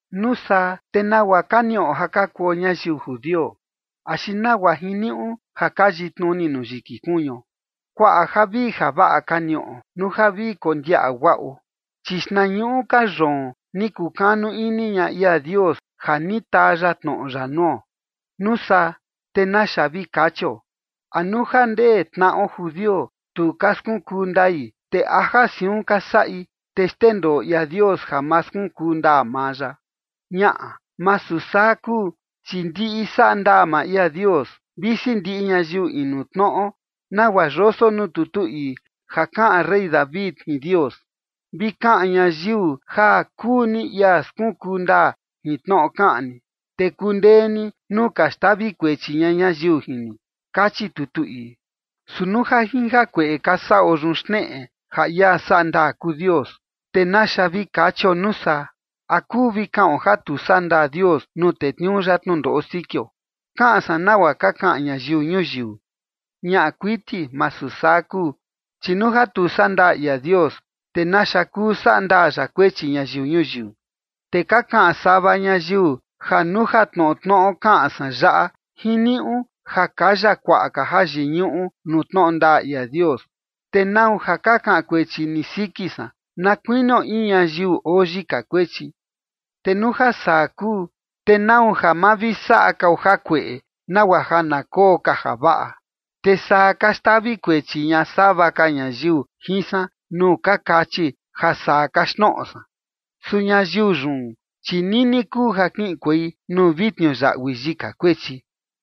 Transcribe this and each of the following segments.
Nuu saa, ¿te nagua ka niꞌo ja ka kuo ñayiu judio? ¿Axi nagua jiniuꞌu ja ka yitnuni nuu yiki kuñuo? Kuaꞌa javii javaꞌa ka niꞌo, nuu ja vi kondiaꞌa guaꞌo. Chi xtnañuꞌu ka yoon ni kukanu ini ña ia Dios ja ni taa ya tnoꞌo ya nuo. Nuu saa, te ¿naxa vi kachio? ¿A nuu ja ndee tnaꞌo judio tu ka skunkuu ndai, te a ja siun ka saꞌi, te xndendoo ia Dios ja ma skunkuu ndaa maa ya? Ñaꞌa, masu saa kuu, chi ndiꞌi saꞌa ndaa maa ia Dios, visi ndiꞌi ñayiu inu tnoꞌo, nagua yoso nuu tutu ii ja kaꞌan rey David jin Dios: Vi kaꞌan ñayiu ja kuu ni ia skunkuu ndaa jin tnoꞌo kaꞌan ni, te kundee ni nuu ka xtavi kuechi ña ñayiu jin ni, kachi tutu ii. Su nuu ja jin jakueꞌe ka saꞌo yun xneꞌe ja ia saꞌa ndaa kuu Dios, te ¿naxa vi kachio, nuu saa? ¿A kuu vi kaꞌon ja tu saꞌa ndaa Dios nuu tetniuu ya tnundoꞌo sikio? (Kaꞌan san nagua ka kaꞌan ñayiu ñuyiu.) Ñaꞌa kuiti masu saa kuu. Chi nuu ja tu saꞌa ndaa ia Dios, ¿te naxa kuu saꞌa ndaa ya kuechi ñayiu ñuyiu? Te ka kaꞌan sava ñayiu ja nuu ja tnoꞌo tnoꞌo kaꞌan san yaꞌa, jiniuꞌu ja kaya kuaꞌa ka jayiñuꞌu nuu tnoꞌo ndaa ia Dios, te ¿nau ja ka kaꞌan kuechi ni siki san, na kuinio in ñayiu oo yika kuechi? Te nuu ja saa kuu, ¿te nau ja ma vi saꞌa kao jakueꞌe nagua ja na koo ka javaꞌa? Te saa ka xtavi kuechi ña sava ka ñayiu jin san nuu ka kachi ja saa kaxtnoꞌo san. Su ñayiu yun, chi nini kuu ja kiꞌinkuei nuu vi tniuyaꞌui yika kuechi.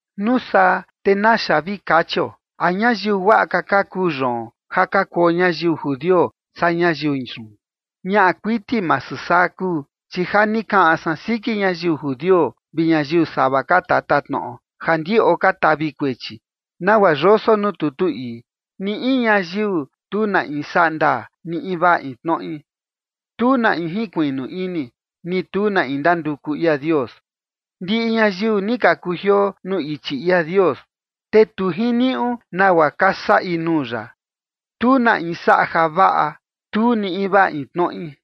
Nuu saa, ¿te naxa vi kachio? ¿A ñayiu guaꞌa ka ka kuu yoon ja ka kuo ñayiu judio saa ñayiu yun? Ñaꞌa kuiti masu saa kuu. Chi ja ni kaꞌan san siki ñayiu judio vi ñayiu sava ka tatatnoꞌo ja ndiꞌo ka tavi kuechi. Nagua yoso nuu tutu ii: Ni in ñayiu tu na in saꞌa ndaa, ni invaa in tnoꞌi. Tu na in jinkuiꞌnu ini, ni tu na in ndanduku ia Dios. Ndiꞌi ñayiu ni ka kujioo nuu ichi ia Dios, te tu jiniuꞌu nagua ka saꞌi nuu ya. Tu na in saꞌa javaꞌa, tu ni invaa in tnoꞌi.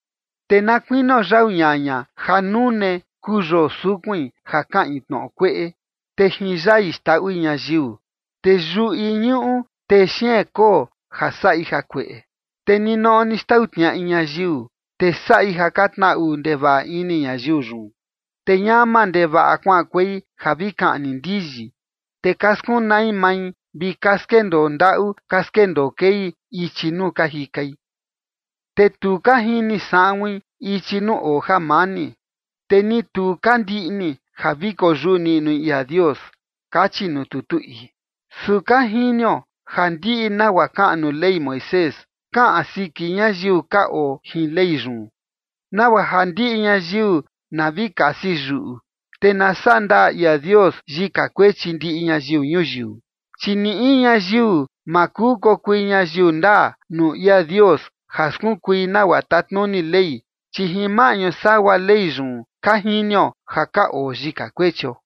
Te na kuinio yau ñaña ja nune kuu yoo sukuin, ja kaꞌin tnoꞌo kueꞌe, te jin yai xndaꞌui ñayiu, te yuꞌi ñuꞌu texeen koo ja saꞌi jakueꞌe. Te ninoꞌo ni xtau tniaꞌi ñayiu, te saꞌi ja ka tnaꞌu ndevaꞌa ini ñayiu yun. Te ñama ndevaꞌa kuaꞌankuei ja vi kaꞌni ndiyi. Te ka skunai mai vi ka skendoo ndaꞌu ka skendoo kei ichi nuu ka jikai. Te tu ka jini saꞌuin ichi nuu oo jamani. Te ni tu ka ndiꞌni ja vi koyuꞌu niꞌnui ia Dios, kachi nuu tutu ii. Su ka jinio ja ndiꞌi nagua kaꞌan nuu Ley Moisés, kaꞌan siki ñayiu ka oo jin Ley yun, nagua ja ndiꞌi ñayiu na vi kasi yuꞌu, te na saꞌa ndaa ia Dios yika kuechi ndiꞌi ñayiu ñuyiu. Chi ni in ñayiu ma kuu kokui ñayiu ndaa nuu ia Dios ja skunkui nagua tatnuni Ley, chi jin maꞌñu sagua Ley yun ka jinio ja ka oo yika kuechio.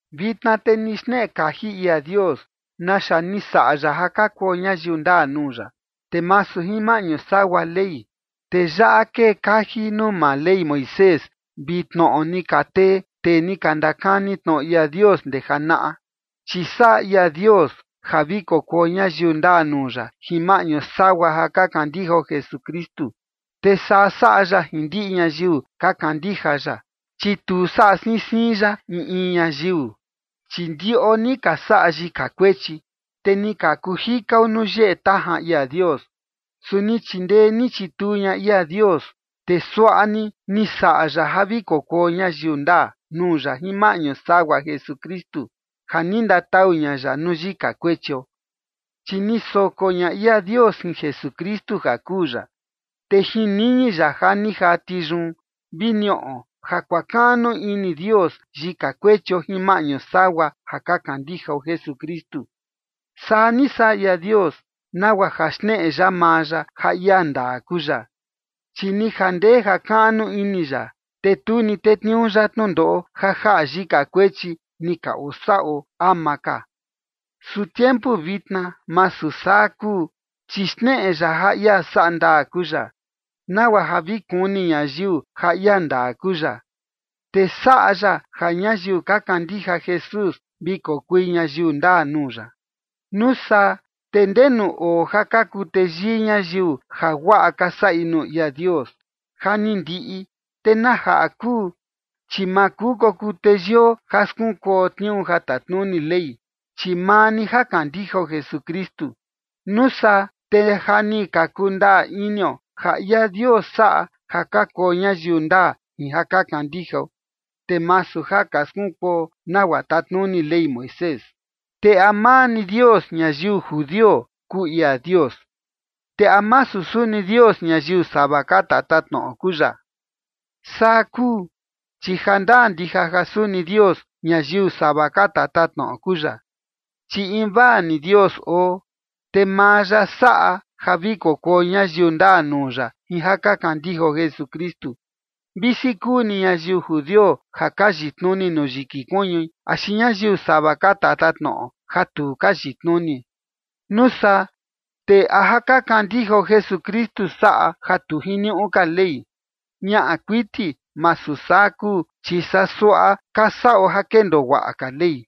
Vitna te ni xneꞌe kaji ia Dios naxa ni saꞌa ya ja ka kuo ñayiu ndaa nuu ya, te masu jin maꞌñu sagua Ley. Te yaꞌa kee kaji nuu maa Ley Moisés vi tnoꞌo ni ka tee, tee ni ka ndakani tnoꞌo ia Dios ndee janaꞌa. Chi saꞌa ia Dios ja vi kokuo ñayiu ndaa nuu ya jin maꞌñu sagua ja ka kandijao Jesukristu, te saa saꞌa ya jin ndiꞌi ñayiu ka kandija ya, chi tu saꞌa siin siin ya in in ñayiu. Chi ndiꞌo ni ka saꞌa yika kuechi, te ni ka kuu jikao nuu yeꞌe tajan ia Dios. Su ni chindee ni chituu ña ia Dios, te suaꞌa ni ni saꞌa ya ja vi kokuo ñayiu ndaa nuu ya jin maꞌñu sagua Jesukristu, ja ni ndatau ña ya nuu yika kuechio. Chi ni soko ña ia Dios jin Jesukristu ja kuu ya, te jin niñi ya ja ni jati yun vi niꞌo ja kuakaꞌnu ini Dios yika kuechio jin maꞌñu sagua ja ka kandijao Jesukristu. Saa ni saꞌa ia Dios nagua ja xneꞌe ya maa ya ja ia ndaa kuu ya. Chi ni jandee jakaꞌnu ini ya, te tu ni tetniuu ya tnundoꞌo ja jaꞌa yika kuechi ni ka osaꞌo ama ka. Su tiempu vitna masu saa kuu, chi xneꞌe ya ja ia saꞌa ndaa kuu ya, nagua ja vi kuni ñayiu ja ia ndaa kuu ya, te saꞌa ya ja ñayiu ka kandija Jesús vi kokui ñayiu ndaa nuu ya. Nuu saa, ¿te ndenu oo ja ka kuu teyii ñayiu jaguaꞌa ka saꞌi nuu ia Dios? Ja ni ndiꞌi. ¿Te na jaꞌa kuu? Chi ma kuu kokuu teyio ja skunkuo tniuu ja tatnuni Ley, chi maa ni ja kandijao Jesukristu. Nuu saa te ja ni ka kundaa inio ja ia Dios saꞌa ja ka kuo ñayiu ndaa jin ja ka kandijao, te masu ja ka skunkuo nagua tatnuni Ley Moisés. Te ¿a maa ni Dios ñayiu judio kuu ia Dios? ¿Te a masu suni Dios ñayiu sava ka tatatnoꞌo kuu ya? Saa kuu, chi jandaa ndija ja suni Dios ñayiu sava ka tatatnoꞌo kuu ya. Chi invaa ni Dios oo, te maa ya saꞌa ja vi kokuo ñayiu ndaa nuu ya jin ja ka kandijao Jesukristu, visi kuu ni ñayiu judio ja ka yitnuni nuu yiki kuñui axi ñayiu sava ka tatatnoꞌo ja tu ka yitnuni. Nuu saa, ¿te a ja ka kandijao Jesukristu saꞌa ja tu jiniuꞌu ka Ley? Ñaꞌa kuiti masu saa kuu. Chi saa suaꞌa ka saꞌo ja kendoo guaꞌa ka Ley.